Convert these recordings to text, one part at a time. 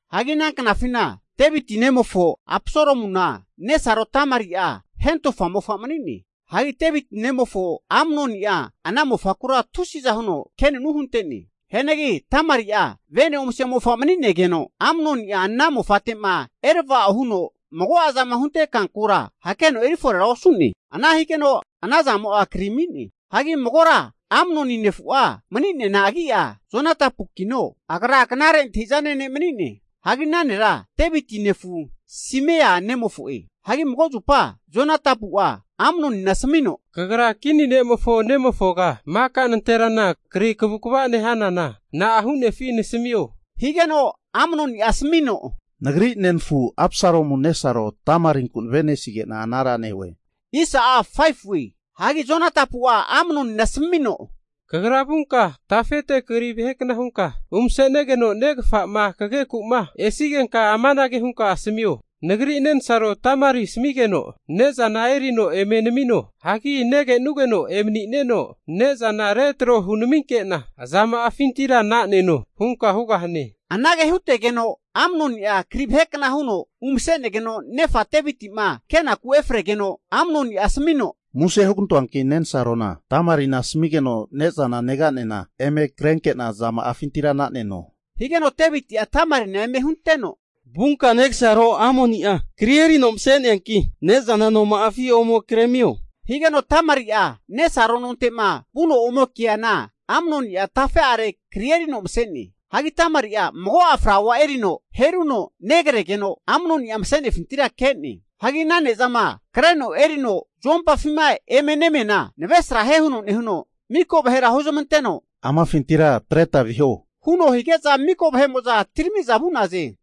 Hagi ana knafina Deviti nemofo Apsalomuna nesaro Tamari'a hentofa mofa mani'ne. Hagi Deviti nemofo Amnoni'a ana mofakura tusiza huno kenunu hunte'ne. Hianagi Tamari'a vene omase mofa mani'negeno, Amnoni'a ana mofate'ma erava'o huno mago'azama hunte kankura hakeno eri forera osu'ne. Ana higeno ana zamo'a kri ami'ne. Hagi magora Amnoni nefu'a mani'neana agi'a Jonadabukino, agra knare antahi'zane ne' mani'ne. Hagi ana nera Deviti nefu Simea nemofo'e. Hagi mago zupa Jonadabu'a Amnonina asamino, Kagra kini ne'mofo nemofoga maka nanterana kri kavukava nehanana, na'a hu'nefi nasamio? Higeno Amnoni'a asamino, Nagri nenafu Apsalomu nesaro Tamarinku nave'nesige'na anara nehue. Hagi Jonadabu'a Amnonina asamino, Kagra vunka tafete kri vahe kna hunka umase'negeno negafa'ma kageku'ma esigenka amanage hunka asamio, nagri nensaro Tamari asamigeno ne'zana erino eme namino. Hagi negenugeno emani'neno ne'zana retro hunaminke'na, azama'afintira naneno hunka hugahane. Anage hutegeno Amnoni'a kri vahekna huno umase'negeno nefa Deviti'ma kenaku efregeno Amnoni'a asamino, Muse hugantoanki nensarona Tamarina asamigeno ne'zana negane'na eme krenke'na azama'afintira na'neno. Higeno Deviti'a Tamarina eme hunteno, Vunka negasaro Amnoni'a kri erino mase'neanki, ne'zana noma'afi ome kremio. Higeno Tamari'a nesaro nonte'ma vuno ome keana Amnoni'a tafe'are kri erino mase'ne. Hagi Tamari'a mago'a flaua erino heruno negregeno, Amnoni'a mase'nefintira ke'ne. Hagi ana ne'zama kreno erino zuompafima eme nemiana navresrahie huno nehuno, miko vahera huzmanteno, Amafintira atreta viho. Huno hige'za miko vahe'mo'za atirami'za vu'naze.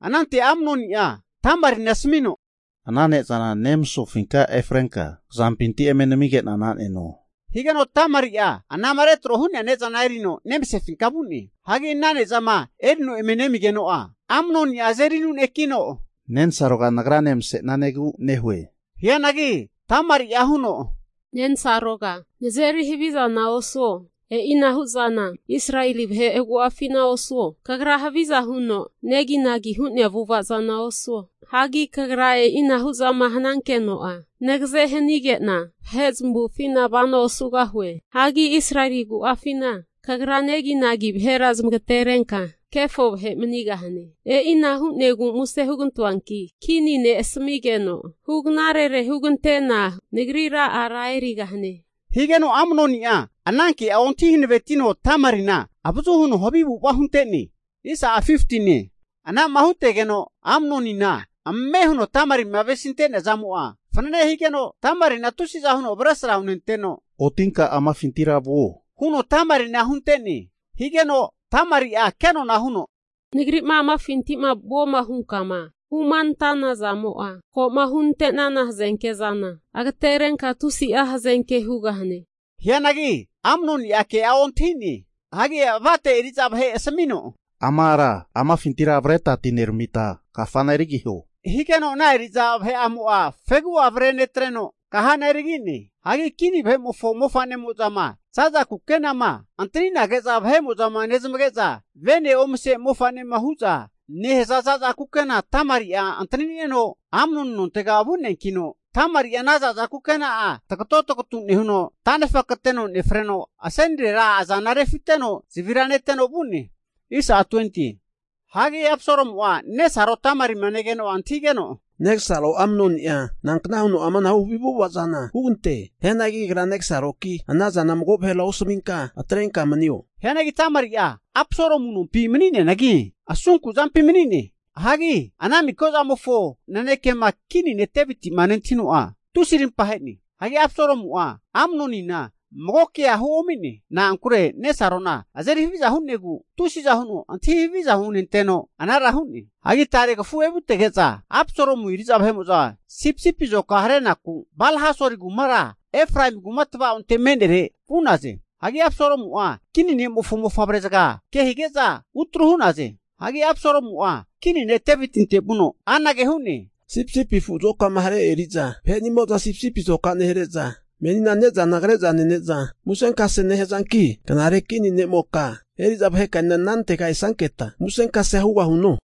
Anante Amnoni'a Tamarina asamino, Ana ne'zana nemasofinka efrenka kazampinti eme namige'na na'neno, higeno Tamari'a anama retro hu'nea ne'zana erino nemasefinka vu'ne. Hagi ana ne'zama erino eme nemigeno'a, Amnonia azeri anunekino, Nensaroga nagrane mase'nanegu nehue. Hianagi Tamari'a huno, nensaroga nazeri havizana osuo. E'inahu zana Israeli vahe agu'afina osuo. Kagra haviza huno neginagi hu'nea avu'ava zana osuo. Hagi kagra e'ina hu'zama hanankeno'a nagaze hanige'na, vahe zamavufina vano osugahue. Hagi Israeli agu'afina kagra neginagi vahera zamagaterenka, kefo vahe manigahane. E'ina hu'negu muse hugantoanki kini ne' asamigeno, hugnarere hugante'na nagrira ara erigahane. Higeno Amnoni'a ana ke'a ontahi hanavetino Tamari'na, avazu huno havi avu'ava hunte'ne. Anama hutegeno Amnonina ame huno Tamarima avesinte'nea zamo'a fanane higeno, Tamarina tusiza huno avesra hunenteno, otinka amafintira vuo, huno Tamarina hunte'ne. Higeno Tamari'a kenona huno, Nagri'ma amafinti'ma vuoma hunkama humanantana zamo'a, ko'ma hu'nante'nana hazenke zana agaterenka tusi'a hazenke hugahane. Hianagi Amnoni'a ke'a ontahi'ne. Hagi avate eri'za vahe asamino, Ama ara amafintira avreta atineramita kafana erigiho. Higeno ana eri'za vahe'amo'a fegu'a avre netreno, kahana erigi'ne. Hagi kini vahe'mofo mofa'nemo'zama za'za kukenama antani'nage'za vahe'mo'za nezmage'za venema omase mofa'ne hu'za nehaza za'za kukena Tamari'a antanineno, Amnoni nontega vu'neankino, Tamari'a ana za'za kukena'a tagoto tagatu nehuno tanefa kateno nefreno, asenirera azana refiteno zavira neteno vu'ne. Hagi Absalomu'a nesaro Tamarima negeno antahigeno, Negasaro Amnoni'a nankna huno amanahu havi avu'ava zana hugante. Hianagi agra negasaroki anazana mago vahera osaminka atrenka manio. Hagi Tamari'a Apsalomu nompi mani'neanagi, asunku zampi mani'ne. Hagi ana mika zamofo nanekema kini ne' Deviti'ma nentahino'a, tusi'a arimpa ahe'ne. Hagi Absalomu'a Amnonina magokea huomi'ne. Na'ankure nesarona azeri haviza hu'negu tusiza huno antahi haviza hunenteno anara hu'ne. Hagi Tare kafu evutege'za Absalomu eri'za vahe'mo'za sipisipi azoka harenaku Balhasori kumara Efraemi kuma tava'onte me'nere vu'naze. Hagi Absalomu'a kini ne'mofo mofavre zaga kehige'za utru hu'naze. Hagi Absalomu'a kini ne' Devitinte vuno anage hu'ne, Sipisipi afu'mofo azokama hare eri'za vahe'nimo'za sipisipi azoka nehare'za menina ne'zana kre'za nene'za musenkase nehazanki, knare kini ne'moka eri'za vahekanena anante esanketa musenkasea hugahuno?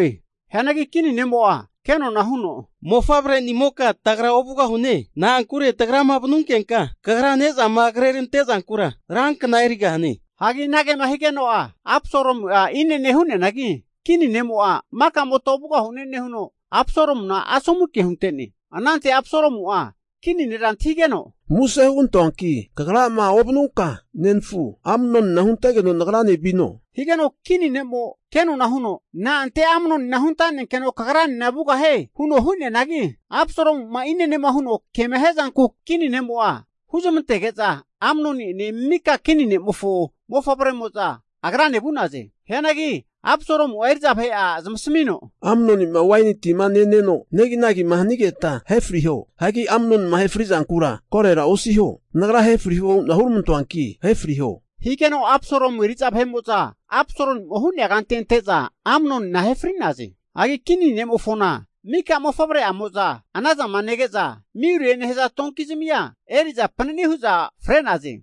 Hianagi kini nemo'a ke'nona huno, Mofavrenimoka tagra ovugahune. Na'ankure tagrama vanunkenka kagra ne'zama krerante zankura rankna erigahane. Hagi anagema higeno'a, Absalomu'a inene hu'neanagi, kini ne'mo'a maka'mota ovugahune nehuno, Absalomuna asomu ke hunte'ne. Anante Absalomu'a kini nera antahigeno, Muse hugantoanki kagrama ovanunka, nenfu Amnonina huntegeno nagrane vino? Higeno kini ne'mo kenona huno, Na'ante Amnonina huntanenkeno kagranena vugahie? huno hu'neanagi, Absalomu'ma inene huno kema hiazanku kini ne'mo'a huzmantege'za, Amnoni'ene mika kini ne'mofo mofavremo'za agrane vu'naze. Hianagi Absalomu'a eri'za vahe'a zamasamino, Amnoni'ma waini tima neno neginagima hanigeta ahe friho. Hagi Amnonima ahe fri zankura korora osiho. Nagra ahe friho hu'na huramantoanki, ahe friho. Higeno Absalomu eri'za vahe'mo'za Absalomu'ma hu'nea kante ante'za, Amnonina ahe fri'naze. Hagi kini ne'mofona maka mofavre'amo'za anazama nege'za, miulie nehaza donkizami'a eri'za panani hu'za fre'naze.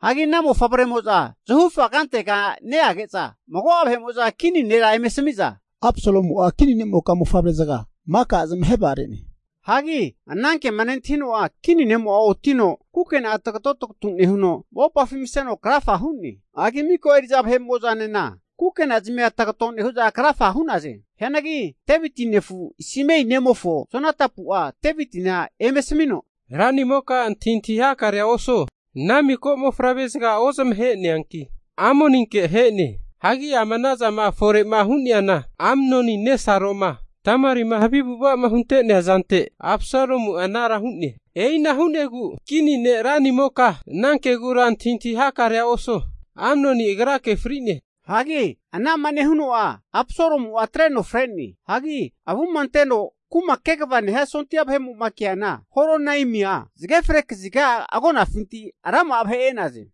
Hagi ana mofavre'mo'za zahufa kantega neage'za, mago'a vahe'mo'za kini nera eme asamiza, Absalomu'a kini ne'moka mofavre zaga maka zamahe vagare'ne. Hagi anankema nentahino'a, kini ne'mo'a otino kukena'a tagato tagatu nehuno mopafi maseno krafa hu'ne. Hagi mika eri'za vahe'mo'zanena kukenazamia tagato nehu'za krafa hu'naze. Hianagi Deviti nefu Simea nemofo Jonadabu'a Devitina eme asamino, ranimoka antahintahi hakarea osuo, ana miko mofavre zaga ozamahe'neanki Amnoninke ahe'ne. Hagi ama anazama fore hu'neana Amnonima nesaroma Tamarima havi avu'ava'ma hunte'nea zante Absalomu'a anara hu'ne. E'ina hu'negu kini ne' ranimoka, ana kegura antahintahi hakarea osuo. Amnoni agrake fri'ne. Hagi anama nehuno'a Absalomu'a atreno fre'ne. Hagi avuma anteno kuma kegava nehia sondia vahe'mo'ma keana Horonaimia zage fre kaziga agonafinti rama'a vahe e'naze.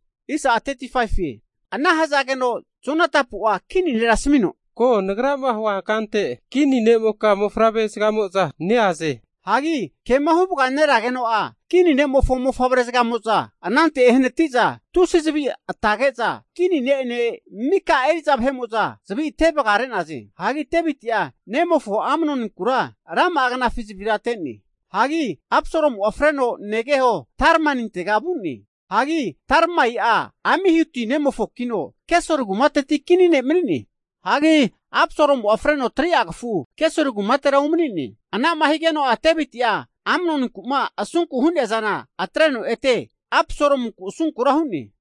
Ana hazageno Jonadabu'a kini nera asamino, Ko nagrama huankante kini ne'moka mofavre zagamo'za neaze. Hagi kema huvaganeregeno'a kini ne'mofo mofavre'zagamo'za anante ehanati'za tusi zavi atage'za, kini ne'ene mika eri'za vahe'mo'za zavi ate vagare'naze. Hagi Deviti'a nemofo Amnoninkura rama'a knafi zavira ate'ne. Hagi Absalomu'a freno negeho Talmaintega vu'ne. Hagi Talmaia Amihudi nemofokino Gesuri kumate kini ne' mani'ne. Hagi Absalomu'a freno 3'a kafu Gesuri kumatera umani'ne. Ana'ma higeno'a Deviti'a Amnoninku'ma asunku hu'nea zana atreno ete Absalomunku asunkura hu'ne.